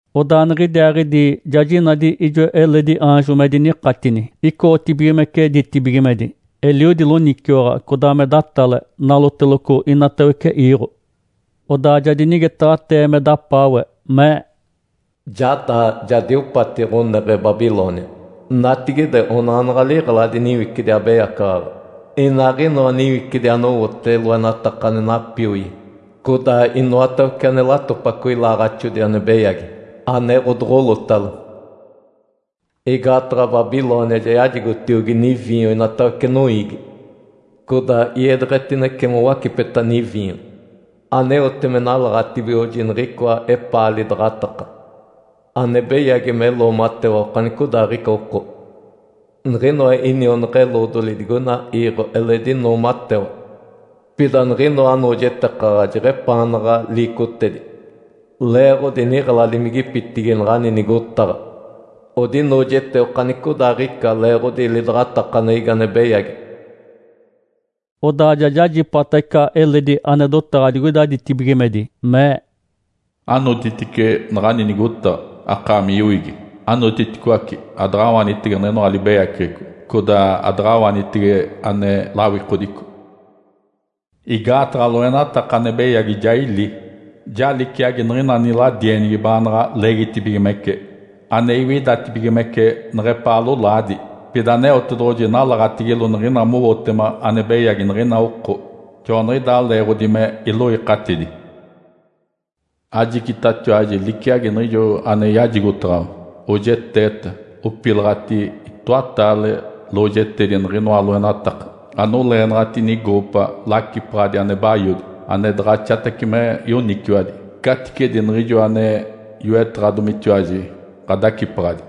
Odaa niɡ̶idiaaɡ̶idi ja jinadi ijo eledi aanjo me dinikatini icoɡ̶otibigimece ditibigimedi. Eliodi loniciwaɡ̶a, codaa me datale, naloteloco inatawece iiɡ̶o. Odaa ja dinigetaɡ̶atee me dapaawe, mee, “Ja daa, ja diopati ɡ̶oneɡ̶e Babilônia. Natigide onanaɡ̶a liɡ̶eladi niwicidi abeyacaɡ̶aɡ̶a, inaaɡ̶inoa niwicidi anowote loenataka ane napioi, codaa inoatawece ane latopaco ilaaɡ̶axodi ane beyagi, ane ɡ̶odoɡ̶olotalo. Igaataɡ̶a Babilônia yajigotiogi niviinyo inatawece noiigi, codaa iedeɡ̶etinece mowacipeta niviinyo aneote me nalaɡ̶atibigoɡ̶oji niɡ̶icoa epaa lidaɡ̶ataka ane beyagi me loomatewa okanicodaaɡ̶ica oko. Niɡ̶inoa inionaɡ̶a-eloodoli digoina iiɡ̶o eledi noomatewa. Pida niɡ̶inoa anoojetekaɡ̶a jeɡ̶epaanaɡ̶a liicotedi leeɡ̶odi niɡ̶eladimigipitigi naɡ̶ani nigotaɡ̶a odinoojete okanicodaaɡ̶ica leeɡ̶odi lidaɡ̶atakaneɡ̶egi ane beyagi.” Odaa ja jajipata ica eledi ane dotaɡ̶a digoida ditibigimedi mee, “Anotitice naɡ̶ani nigotaɡ̶a, akaami yoiigi! Anotiticoace! Adaɡ̶awanitege niɡ̶inoa libeyaceɡ̶eco, codaa adaɡ̶awanitege ane lawikodico. Igaataɡ̶a loenataka ane beyagi ja ili, ja liciagi niɡ̶ina niladienigi baanaɡ̶a leegitibigimece, ane iwidatibigimece neɡ̶epaa lolaadi. Pida Aneotedoɡ̶oji nalaɡ̶atigilo niɡ̶ina mowotema ane beyagi niɡ̶ina oko, joaniɡ̶idaa leeɡ̶odi me iloikatidi. Ajicitatiwaji liciagi niɡ̶ijo ane yajigotaɡ̶awa! Oojeteeta, opilaɡ̶ati itoataale lojetedi niɡ̶inoa loenataka! Anoleenaɡ̶ati nigoopa lacipaɡ̶adi ane bayodi, ane daɡ̶axatace me yoniciwadi, caticedi niɡ̶ijo ane yoetaɡ̶adomitiwaji ɡ̶adacipaɡ̶adi.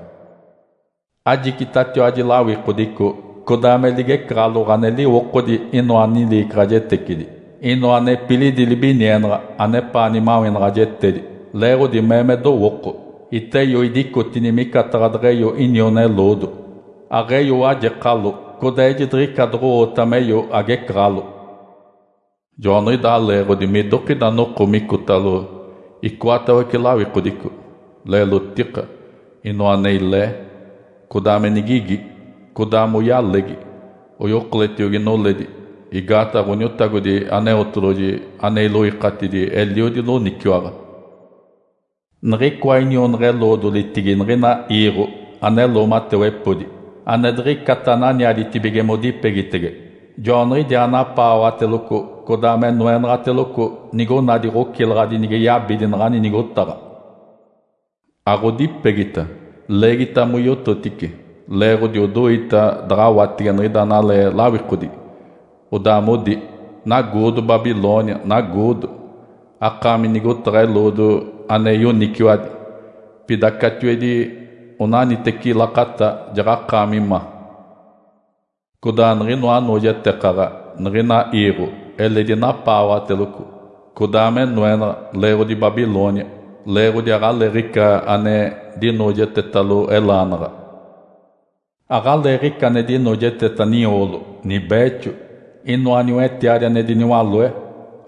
Ajicitatiwaji lawikodico, codaa me ligecaɡ̶aloɡ̶o ane liwokodi inoa niliicaɡ̶ajetecidi, inoa nepilidi libinienaɡ̶a anepaa nimawenaɡ̶ajetedi. Leeɡ̶odi mee me dowooko, ‘Iteyo, idicotini micataɡ̶a deɡ̶eyo iniona-eloodo. Aɡ̶eyo wajekalo, codaa ejidiɡ̶ica doɡ̶o-oota meyo agecaɡ̶alo.’ Joaniɡ̶idaa leeɡ̶odi midokida noko micotalo icoatawece lawikodico, leelotika, inoa ane ilee, codaa me nigigi. Codaa moyalegi, oyokoletiogi noledi. Igaataɡ̶a Ǥoniotagodi Aneotedoɡ̶oji ane iloikatidi eliodi loniciwaɡ̶a. Niɡ̶icoa inionaɡ̶a-eloodolitigi niɡ̶ina iiɡ̶o ane loomatewepodi, ane diɡ̶icata ananiaditibige modipegitege, joaniɡ̶idiaa napaawaɡ̶ateloco codaa me noenaɡ̶ateloco nigonadi ɡ̶ocilaɡ̶adi nige yabidi naɡ̶ani nigotaɡ̶a. Aɡ̶odipegita, leegita moyototice leeɡ̶odi odoita daɡ̶awatege niɡ̶ida analee lawikodigi, odaa modi, ‘Nagoodo Babilônia, nagoodo! Akaami nigotaɡ̶a eloodo ane yoniciwadi. Pida catiwedi onaniteci lakata jaɡ̶akaami ma.’ Codaa niɡ̶inoa anoojetekaɡ̶a niɡ̶ina iiɡ̶o eledi napaawaɡ̶ateloco codaa me noenaɡ̶a leeɡ̶odi Babilônia, leeɡ̶odi aɡ̶aleeɡ̶ica ane dinoojetetalo elaanaɡ̶a. Aɡ̶aleeɡ̶ica ane dinoojeteta nioolo, nibeexo, inoa niwetiadi ane diniwaloe,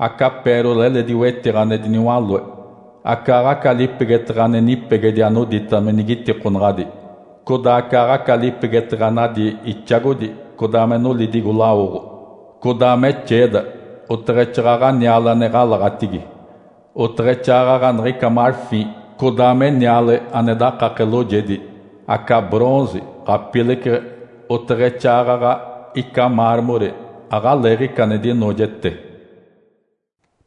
aca ‘pérola’ eledi wetiɡ̶a ane diniwaloe, acaaɡ̶aca lipegeteɡ̶e ane nipegedi anodita me nigitikonaɡ̶adi, codaa acaaɡ̶aca lipegeteɡ̶e ane adi ixagodi codaa me nolidigo lawoɡ̶o, codaa me xeeda, oteɡ̶exaaɡ̶aɡ̶a niale ane ɡ̶alaɡ̶atigi, oteɡ̶exaaɡ̶aɡ̶a niɡ̶ica ‘marfim’, codaa me niale ane dakake loojedi, aca ‘bronze’, ɡ̶apileceɡ̶e, oteɡ̶exaaɡ̶aɡ̶a ica ‘mármore’, aɡ̶aleeɡ̶ica ane dinoojete.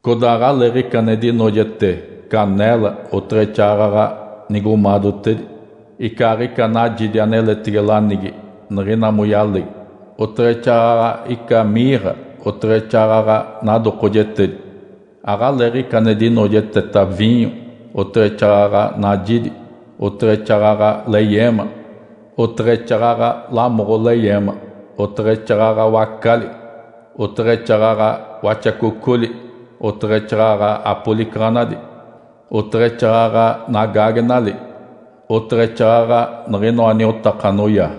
Codaa aɡ̶aleeɡ̶ica ane dinoojete caneela, oteɡ̶exaaɡ̶aɡ̶a nigomaadotedi, icaaɡ̶ica najidi aneletege lanigi niɡ̶ina moyalegi, oteɡ̶exaaɡ̶aɡ̶a ica ‘mirra’, oteɡ̶exaaɡ̶aɡ̶a nadokojetedi. Aɡ̶aleeɡ̶ica ane dinoojeteta viinyo, oteɡ̶exaaɡ̶aɡ̶a najidi, oteɡ̶exaaɡ̶aɡ̶a leyeema, oteɡ̶exaaɡ̶aɡ̶a lamoɡ̶o leyeema, oteɡ̶exaaɡ̶aɡ̶a wacali, oteɡ̶exaaɡ̶aɡ̶a waxacocoli, oteɡ̶exaaɡ̶aɡ̶a apolicaɡ̶anadi, oteɡ̶exaaɡ̶aɡ̶a nagaagenali, oteɡ̶exaaɡ̶aɡ̶a niɡ̶inoa niotaka anoyaa.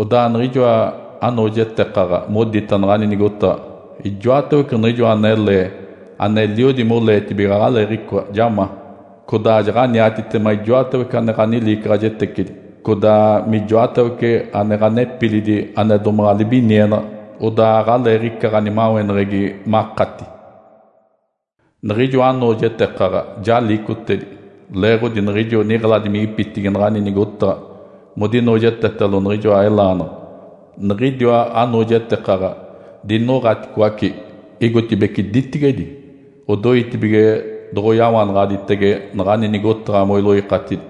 Odaa niɡ̶ijoa anoojetekaɡ̶a modita naɡ̶ani nigotaɡ̶a, ‘Ijoatawece niɡ̶ijoa anele aneliodi moleetibige aɡ̶aleeɡ̶icoa, ja ma. Codaa jaɡ̶aniatitema ijoatawece ane ɡ̶aniliicaɡ̶ajetecidi, codaa mijoatawece ane ɡ̶anepilidi ane domaɡ̶a libinienaɡ̶a. Odaa aɡ̶aleeɡ̶ica ɡ̶animaweneɡ̶egi makati.’ Niɡ̶ijoa anoojetekaɡ̶a ja liicotedi leeɡ̶odi niɡ̶ijo niɡ̶eladimigipitigi naɡ̶ani nigotaɡ̶a modinoojetetalo niɡ̶inoa elaanaɡ̶a. Niɡ̶idiwa anoojetekaɡ̶a dinoɡ̶aticoace igotibeci ditigedi, odoitibige doɡ̶oyawanaɡ̶aditege naɡ̶ani nigotaɡ̶a moiloikatidi.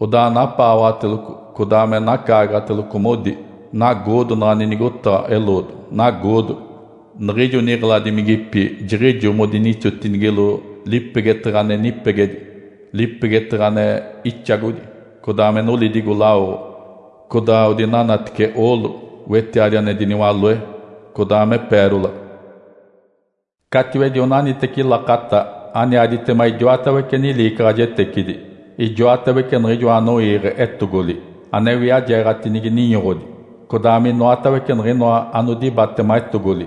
Odaa napaawaɡ̶ateloco, codaa me nacaagaɡ̶ateloco, modi, ‘Nagoodo naɡ̶ani nigotaɡ̶a eloodo! Nagoodo! Niɡ̶ijo niɡ̶eladimigipi jiɡ̶ijo modinixotinigilo lipegeteɡ̶e ane nipegedi, lipegeteɡ̶e ane ixagodi, codaa me nolidigo lawoɡ̶o, codaa odinanatece oolo, wetiadi ane diniwaloe, codaa me “pérola”. Catiwedi onaniteci lakata aniaditema idiwatawece niliicaɡ̶ajetecidi.’ Ijoatawece niɡ̶ijoa anoiiɡ̶e etogoli, ane wiajeeɡ̶atinigi ninyoɡ̶odi, codaa minoatawece niɡ̶inoa anodibatema etogoli,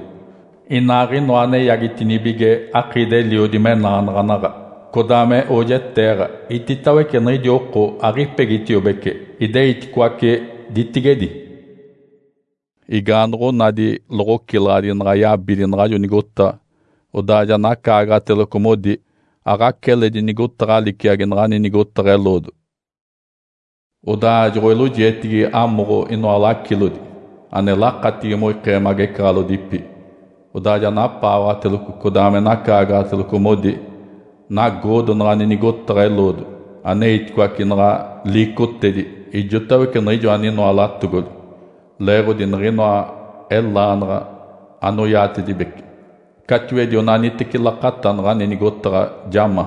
inaaɡ̶inoa ane eyaagitinibige akiidi-eliodi menaanaɡ̶anaɡ̶a, codaa me oojeteeɡ̶a, iditawece niɡ̶idi oko aɡ̶ipegitiobece, ideiticoace ditigedi. Igaanoɡ̶onadi loɡ̶ocilaɡ̶adi naɡ̶a yabidi naɡ̶ajo nigotaɡ̶a, odaa ja nacaagaɡ̶ateloco modi, ‘Aɡ̶aca eledi nigotaɡ̶a liciagi naɡ̶ani nigotaɡ̶a eloodo!’ Odaa joɡ̶oilojietigi amoɡ̶o inoa lacilodi (ane lakatigi moikee magecaɡ̶alodipi), odaa ja napaawaɡ̶ateloco codaa me nacaagaɡ̶ateloco, modi, ‘Nagoodo naɡ̶ani nigotaɡ̶a eloodo aneiticoace naɡ̶a liicotedi ijotawece niɡ̶ijo aninoa latogoli, leeɡ̶odi niɡ̶inoa elaanaɡ̶a anoyadeegitedibece. Catiwedi onaniteci lakata naɡ̶ani nigotaɡ̶a ja ma.’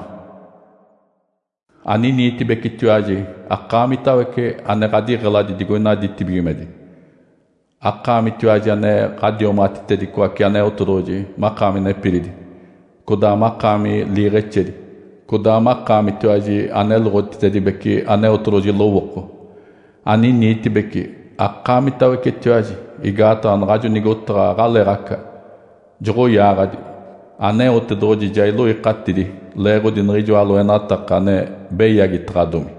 Aniniitibecetiwaji akaamitawece ane ɡ̶adiɡ̶eladi digoida ditibigimedi, akaamitiwaji ane ɡ̶adiomaɡ̶atitedicoace Aneotedoɡ̶oji makaami nepilidi, codaa makaami liiɡ̶exedi, codaa makaamitiwaji aneloɡ̶otitedibece Aneotedoɡ̶oji lowooko! Aniniitibece akaamitawecetiwaji igaataɡ̶a naɡ̶ajo nigotaɡ̶a aɡ̶aleeɡ̶aca, joɡ̶oyaaɡ̶adi. Aneotedoɡ̶oji ja iloikatidi leeɡ̶odi niɡ̶ijoa loenataka ane beyagitaɡ̶adomi.”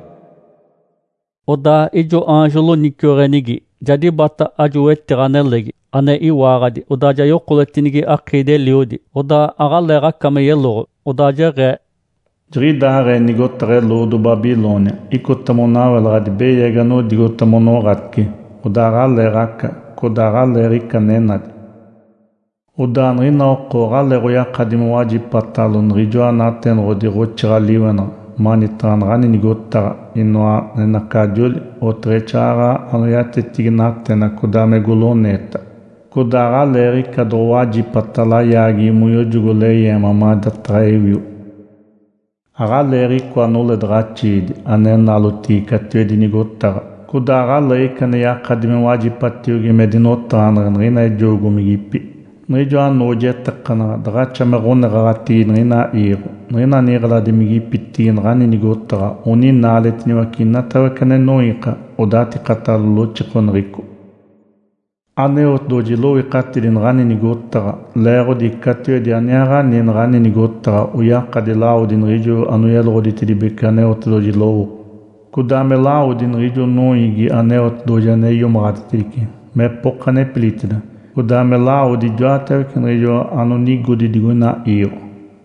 Odaa ijo aanjo loniciweɡ̶enigi ja dibata ajo wetiɡ̶a nelegi, ane iwaaɡ̶adi, odaa ja yokoletinigi akiidi-eliodi, odaa aɡ̶aleeɡ̶aca me yeloɡ̶o. Odaa jeɡ̶ee, “Jiɡ̶idaaɡ̶ee nigotaɡ̶a eloodo Babilônia icota monawelaɡ̶adi beyagi anodigota monoɡ̶atice, odaa aɡ̶aleeɡ̶aca, codaa aɡ̶aleeɡ̶ica ane nadi. Odaa niɡ̶ina oko aɡ̶aleeɡ̶oyakadi mowajipatalo niɡ̶ijoa natenoɡ̶ododi ɡ̶oxiiɡ̶a-liwenaɡ̶a manitaɡ̶a naɡ̶ani nigotaɡ̶a, inoa enacajoli, oteɡ̶exaaɡ̶aɡ̶a anoyatetigi natena codaa me goloneeta. Codaa aɡ̶aleeɡ̶ica doɡ̶owajipata layaageɡ̶egi moyojogo leyeema madataɡ̶a ewio. Aɡ̶aleeɡ̶icoa noledaɡ̶axiidi ane nalotigi catiwedi nigotaɡ̶a, codaa aɡ̶aleeɡ̶ica ane yakadi me wajipatiogi me dinotaɡ̶aneɡ̶e niɡ̶ina ejoogomigipi. Niɡ̶ijoa noojetekenaɡ̶a daɡ̶axa me ɡ̶oneɡ̶aɡ̶atigi niɡ̶ina iiɡ̶o. Niɡ̶ina niɡ̶eladimigipitigi naɡ̶ani nigotaɡ̶a oninaaletiniwace inoatawece ane noiika, odatikatalo loxikoneɡ̶eco. Aneotedoɡ̶oji iloikatidi naɡ̶ani nigotaɡ̶a leeɡ̶odi catiwedi aniaaɡ̶ani naɡ̶ani nigotaɡ̶a oyakadi lawodi niɡ̶ijo anoyeloɡ̶oditedibece Aneotedoɡ̶oji lowooko, codaa me lawodi niɡ̶ijo noiigi Aneotedoɡ̶oji ane iomaɡ̶aditedice mepoka nepiliditeda, codaa me lawodi ijotawece niɡ̶ijo anonigodi digoina iiɡ̶o.”